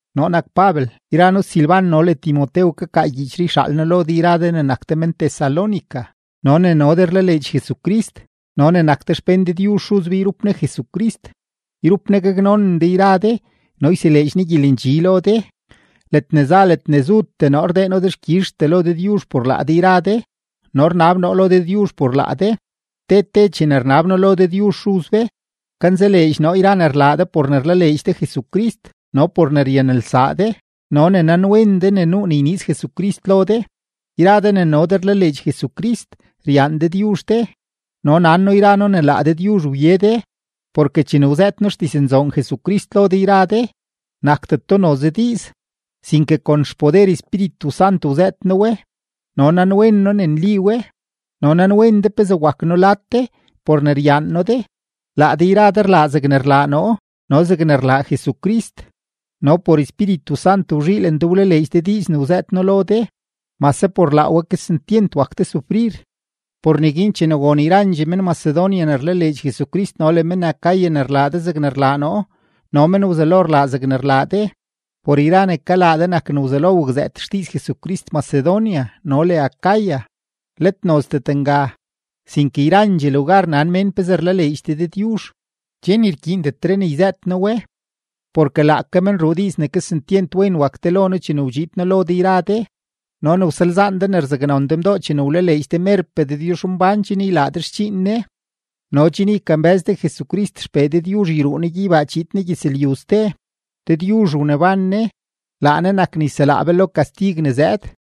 Noo nak Pabel, yra noo Silban no le Timotew kakaa gyiichree yxaal noo lo de yra de ne nak de men-Tesalónica no ne no de rlaleedx Jesucrist no ne nak de xpén Dëdyuzh Xuz be yrup Ne Jesucrist. Yrup Ne gaknonen de yra de no yseleedx Ne gyelendxi lo de. Ledne za ledne zutee noo rdee noo dexkyizhtee lo Dëdyuzh por laa de yra de no rnab noo lo Dëdyuzh por laa de. Te te chene rnab noo lo Dëdyuzh Xuz be, kanzaleedx noo yra ne rlaa de por ne rlaleedx de Jesucrist no por ne ryanelsaa de no ne nanwen de ne nuu ne yniiz Jesucrist lo de. Yra de ne no de rlaleedx Jesucrist, ryaan Dëdyuzh de, no nan noo yra noo ne laa Dëdyuzh wye de. Porke chene wzëët noo xdiznzoon Jesucrist lo de yra de, nakdeto noze diiz, sinke kon xpoder Espíritu Sant wzëët noo we no nanwen noo ne nli we. No nanwen de pezee wak noo lad de, por ne ryaan noo de. Laa de yra de rlaa de zegne rlaa noo no zegne rlaa Jesucrist, no por Espíritu Sant wzhiilen de wlaleedx de diiz ne wzëët noo lo de, mase por laa we kesentyent wak de sufrir. Por neguin chene won yrandxee men-Macedonia ne rlaleedx Jesucrist no le men-Acaya ne rlaa de zegne rlaa noo, no men wzelo rlaa zegne rlaa de. Por yra ne kalaa de nak ne wzelo wakzëët xdiiz Jesucrist Macedonia no le Acaya, let nozdet nga, sinke yrandxee lugar nan mén pezee rlaleedx de Dëdyuzh, che ni rkyiindetre ne yzëët noo we. Porke laake men ruu diiz ne kesentyent wen wak de lo noo chene wdxiid noo lo de yra de no ne wsalzaan de ne rzaknon de mdoo chene wlaleedx de merpee Dëdyuzhmbán chen ylaa de xdxiin Ne no chen ykambë́z de Jesucrist XPee Dëdyuzh yruu Ne gyeybaa chiid Ne gyëzlyu ste. Dëdyuzh wneban Ne; laa Ne nak ne yselaa be lo kastig ne zëëd.